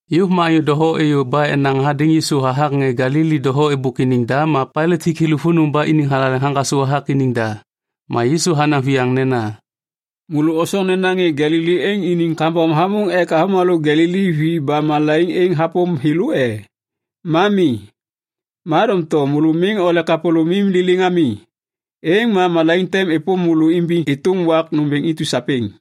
Yôv ma anyô doho êyô ba enaŋ hadêŋ Yisu hathak ŋê Galili doho êbôk iniŋ da ma Pailat hik thêlô vônô ba iniŋ thalaleŋ haŋgasô hathak iniŋ da. Ma Yisu hanaŋ viyaŋ nena, “Môlô osoŋ nena ŋê Galili êŋ iniŋ kambom hamôŋ ek avômalô Galili vi ba malaiŋ êŋ hapôm thêlô e? Ma mi. Ma doŋtom môlô miŋ ole kapôlômim liliŋ ami, êŋ ma malaiŋ tem êpôm môlô imbiŋ êtôm wak nômbêŋ intu sapêŋ.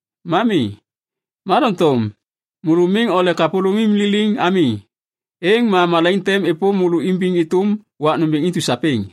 Ma mi. Ma doŋtom môlô miŋ ole kapôlômim liliŋ ami, êŋ ma malaiŋ tem êpôm môlô imbiŋ êtôm wak nômbêŋ intu sapêŋ.”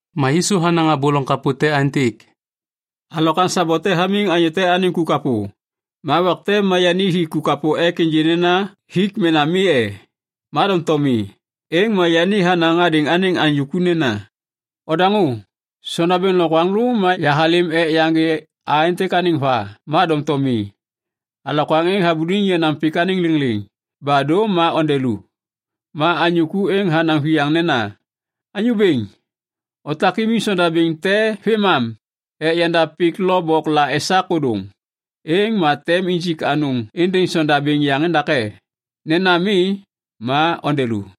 Ma Yisu hanaŋ abô loŋ kapô te aêntêk, “Alokwaŋ sabo te hamiŋ anyô te anêŋ ku kapô. Ma wak te ma yani hi ku kapô ek ênjê nena hik mena mi e? Ma doŋtom mi. Êŋ ma yani hanaŋ hadêŋ anêŋ anyô ku nena, ‘Ondaŋô. Sondabêŋ lokwaŋlô ma yahalêm ek yaŋgê a êntêk anêŋ va ma doŋtom mi. Alokwaŋ êŋ habuliŋ yenaŋ pik anêŋ lêŋlêŋ, ba dô ma onde lu.’ “Ma anyô ku êŋ hanaŋ viyaŋ nena, ‘Anyô bêŋ, otak imiŋ sondabêŋ te vêmam ek yandav pik lo bok la esak ôdôŋ. Êŋ ma tem injik anôŋ êndêŋ sondabêŋ yaŋ endake. Nena mi, ma onde lu.’”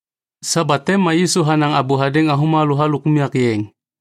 Sabat te ma Yisu hanaŋ abô hadêŋ avômalô halôk unyak yeŋ.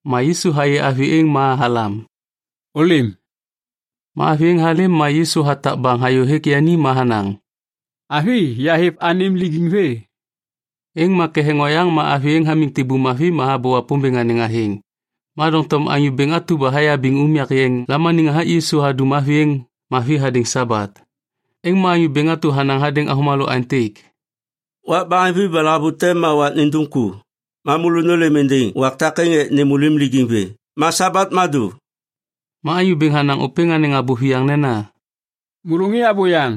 Ma Yisu hayê avi êŋ ma halam “Ôlêm.” Ma avi êŋ halêm ma Yisu hatak baŋ hayôhêk yani ma hanaŋ, “Avi, yahêv anêm lijiŋ vê.” Êŋ ma ketheŋ oyaŋ ma avi êŋ hamiŋ tibum mavi ma habô Wapômbêŋ anêŋ athêŋ. Ma doŋtom anyô bêŋ atu ba hayabiŋ unyak yeŋ lamaniŋ hathak Yisu hadum avi êŋ mavi hadêŋ Sabat. Êŋ ma anyô bêŋ atu hanaŋ hadêŋ avômalô aêntêk, “Wak baheŋvi ba lahavute ma wak nindum ku. Ma môlô nôlêm êndêŋ wak takêŋ ek nêm môlônim lijiŋ vê, ma Sabat ma dô.” Ma Anyô Bêŋ hanaŋ ôpêŋ anêŋ abô viyaŋ nena, “Môlô ŋê abôyaŋ.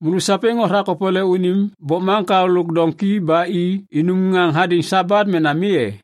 Môlô sapêŋ othak opole unim bokmaŋkao lôk doŋki ba i inum ŋaŋ hadêŋ Sabat mena mi e?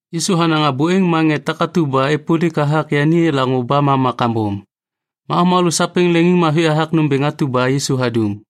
Yisu hanaŋ abô êŋ ma ŋê takatu ba êpôlik hathak yani elaŋô ba mama kambom, ma avômalô sapêŋ leŋiŋmavi hathak nômbêŋ atu ba Yisu hadum.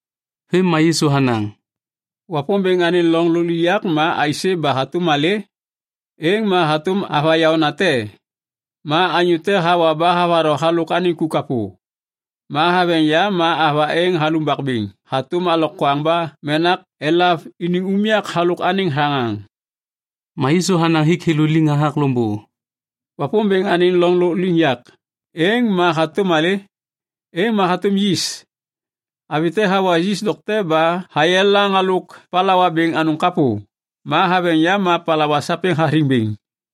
Vêm ma Yisu hanaŋ, “Wapômbêŋ anêŋ loŋ lôkliŋyak ma aisê ba hatôm malê? Êŋ ma hatôm ava yaônate. Ma anyô te hawa ba havatho halôk anêŋ ku kapô. Ma haveŋ yam ma ava êŋ halumbak bêŋ hatôm alokwaŋ ba menak elav iniŋ unyak halôk anêŋ thaŋaŋ.” Ma Yisu hanaŋ hik thêlô liŋ hathak loŋbô, “Wapômbêŋ anêŋ loŋ lôkliŋyak, êŋ ma hatôm malê? Êŋ ma hatôm yis. Avi te hawa yis dokte ba hayelaŋ halôk palawa bêŋ anôŋ kapô, ma haveŋ yam ma palawa sapêŋ hathiŋ bêŋ.”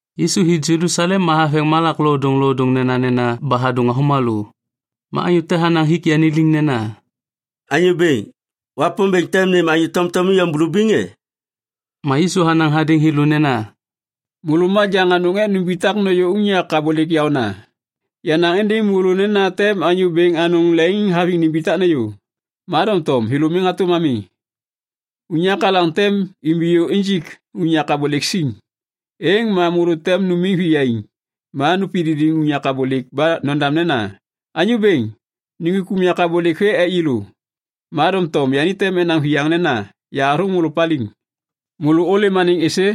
Yisu hi Jelusalem ma haveŋ malak lodôŋlodôŋ nenanena ba hadôŋ avômalô. Ma anyô te hanaŋ hik yani liŋ nena, “Anyô Bêŋ, Wapômbêŋ tem nêm anyô tomtom iyom bulubiŋ e?” Ma Yisu hanaŋ hadêŋ thêlô nena, “Môlô majaŋ anôŋ ek numbitak nôyô unyak abôlêk yaôna. Yanaŋ êndêŋ môlô nena tem anyô bêŋ anôŋ leŋiŋhaviŋ nimbitak nêyô, ma doŋtom thêlô miŋ hatôm ami. Unyak alaŋ tem imbiyô injik unyak abôlêk siŋ, êŋ ma môlô tem numiŋ viyaiŋ ma nupididiŋ unyak abôlêk ba nodam nena, ‘Anyô bêŋ, nuŋgwik unyak abôlêk vê ek yêlô.’ “Ma doŋtom yani tem enaŋ viyaŋ nena, ‘Yahathôŋ môlô paliŋ. Môlô ôlêm anêŋ êsê?’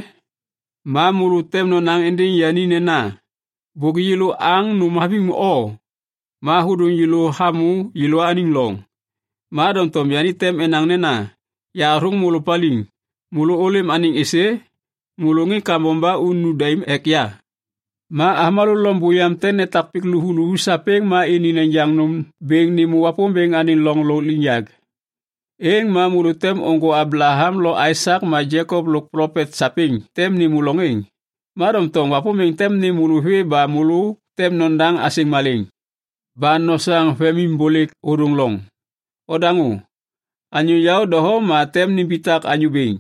“Ma môlô tem nonaŋ êndêŋ yani nena, ‘Bôk yêlô aŋ nôm haviŋ o ma hôdôŋ yêlô hamô yêlôaniŋ loŋ.’ Ma doŋtom yani tem enaŋ nena, ‘Yahathôŋ môlô paliŋ. Môlô ôlêm anêŋ êsê? Môlô ŋê kambom ba unu daim ek ya!’ “Ma avômalô loŋ buyaŋ tem netak pik luvuluvu sapêŋ ma ini nejaŋ nôm bêŋ nêmô Wapômbêŋ anêŋ loŋ lôkliŋyak. Êŋ ma môlô tem ôŋgô Ablaham lo Aisak ma Jekop lôk plopet sapêŋ tem nêmô loŋ êŋ. Ma doŋtom Wapômbêŋ tem nêm môlô vê ba môlô tem nodaŋ asêŋ malêŋ ba nosaŋ vemimbôlêk ôdôŋ loŋ. Odaŋô, anyô yaô doho ma tem nimbitak anyô bêŋ.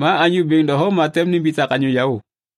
Ma anyô bêŋ doho ma tem nimbitak anyô yaô.”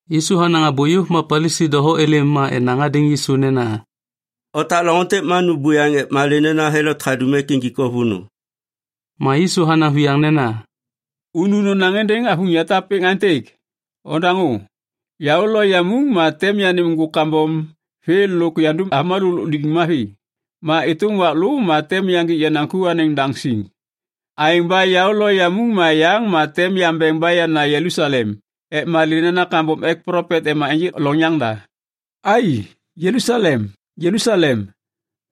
Yisu hanaŋ abô yôv ma Palisi doho êlêm ma enaŋ hadêŋ Yisu nena, “Otak loŋ êntêk ma nu buyaŋ ek malê nena Helot hadum ek injik o vônô.” Ma Yisu hanaŋ viyaŋ nena, “Unu nonaŋ êndêŋ avuŋ yatap êŋ aêntêk, ‘Ondaŋô, yaô lo yamuŋ ma tem yanêm ŋgôk kambom vê lôk yandum avômalô lôk lijiŋ mavi. Ma êtôm wak lô ma tem yaŋgik yenaŋ ku anêŋ daŋ siŋ.’ Aêŋ ba yaô lo yamuŋ ma yaŋ ma tem yambeŋ ba yana Jelusalem ek malê nena kambom ek plopet ema ênjêk loŋ yaŋda. “Ai, Jelusalem, Jelusalem!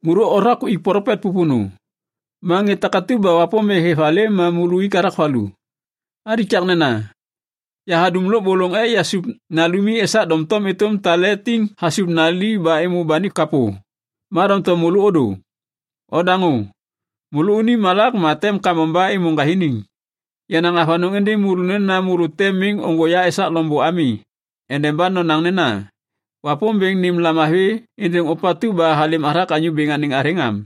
Môlô othak uik plopet pôpônô. Ma ŋê takatu ba Wapômbêŋ hêv halêm ma môlô uik i hathak valu! Alikaknena! Yahadum lôbôlôŋ ek yasup nalumi esak doŋtom êtôm tale tiŋ hasup nali ba êmô banik kapô. Ma doŋtom môlô ôdô! Odaŋô! Môlônim malak ma tem kambom ba êmô ŋgathiniŋ! Yanaŋ avanôŋ êndêŋ môlô nena môlô tem miŋ ôŋgô ya esak loŋbô ami endeba nonaŋ nena, ‘Wapômbêŋ nêm lamavi êndêŋ ôpatu ba halêm hathak Anyô Bêŋ anêŋ athêŋ!’ am.”